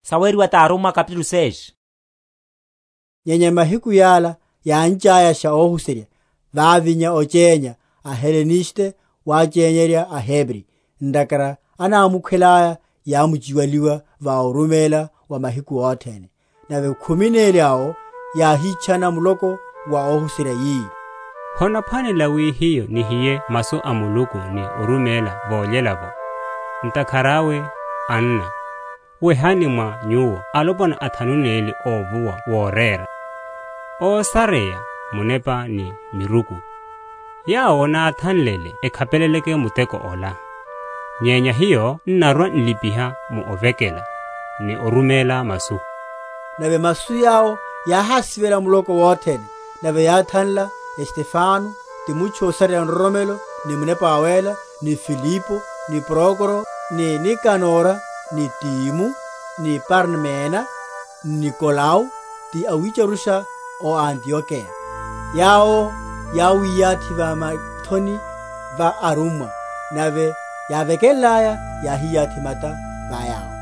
Othanliwa wa alipa‐oruméla athanu neli. Nyenya mahiku yala, yáncháyasha óhuserya, vávinya ochénya, aHeleniste wachenyerya aHebri, ntakhara anámukhwele aya yámchiwaliwa va oruméla wa mahiku othene. Nave khumi neli awo yáhitchana muloko wa óhuserya, yi, Honaphwanela wi hiyo nihiye masu a Muluku ni oruméla vólyela’vo. Ntakhara awe, anna, wehani mwa nyuwo alopwana athanu neli a ovuwa worera, ósareya Munepa ni miruku, yawo náthanlele ekhapeleleke muteko ola. Nyenya hiyo n’narwa‐n’lipiha mu’vekela, ni oruméla masu. Nave masu yawo yáhásivela muloko wothene; nave yáthanla Stefano ti mutchu ósareya nroromelo ni Munepa Wawéla, ni Filipo, ni Prokoro, ni Nikanora ni Timo, ni Parmena, n’Nikolao, ti awitcharusha a o Antiokeya: yawo yáwiyathi va mithoni va arummwa; nave yávekenlaya yáhiyathi mata va yawo.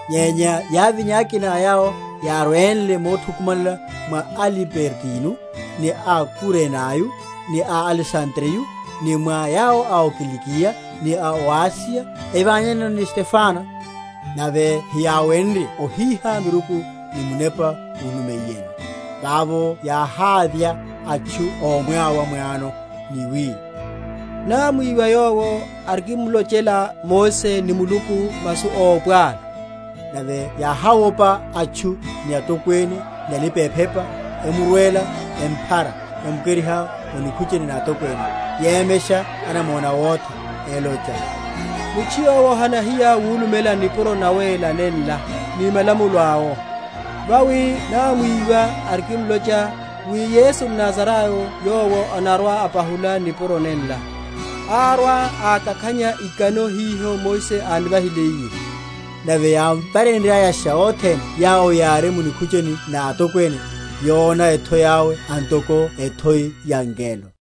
Nyenya yávinya akina a yawo yárwenle mothukumanela mwa a Libertino, ni a Kurenayo, ni a Alesandreyo, ni mwa yawo ó Kilikiya ni a o Asiya, evanyana ni Stefano. Nave hiyáwenrye ohiha miruku ni Munepa úlumiyeno. Vavo yáhávya atchu ómwáwa m’wano, ni wi, Námwiwa yowo arikimmulochela Mose ni Muluku masu ópwalu. Nave yáháwopa atchu, ni atokwene, ni alipa‐orepa, emurwela, emphara, emukeriha o nikhucheni na atokwene, yemesha anamona awotha, olocha, Mutchu yowo hanahiya wulumela nipuro nawéla nenla, ni malamulo awo: vawi námwiwa arikimlocha, wi, Yesu mNazarayo yowo anarwa‐apahula nipuro nenla, arwa‐ákakhanya ikano hiho Mose ánivahiliye. Nave yámvareryasha othene yawo yári mu nikhucheni na atokwene, yona ethoi awe antoko ethoi ya ngelo.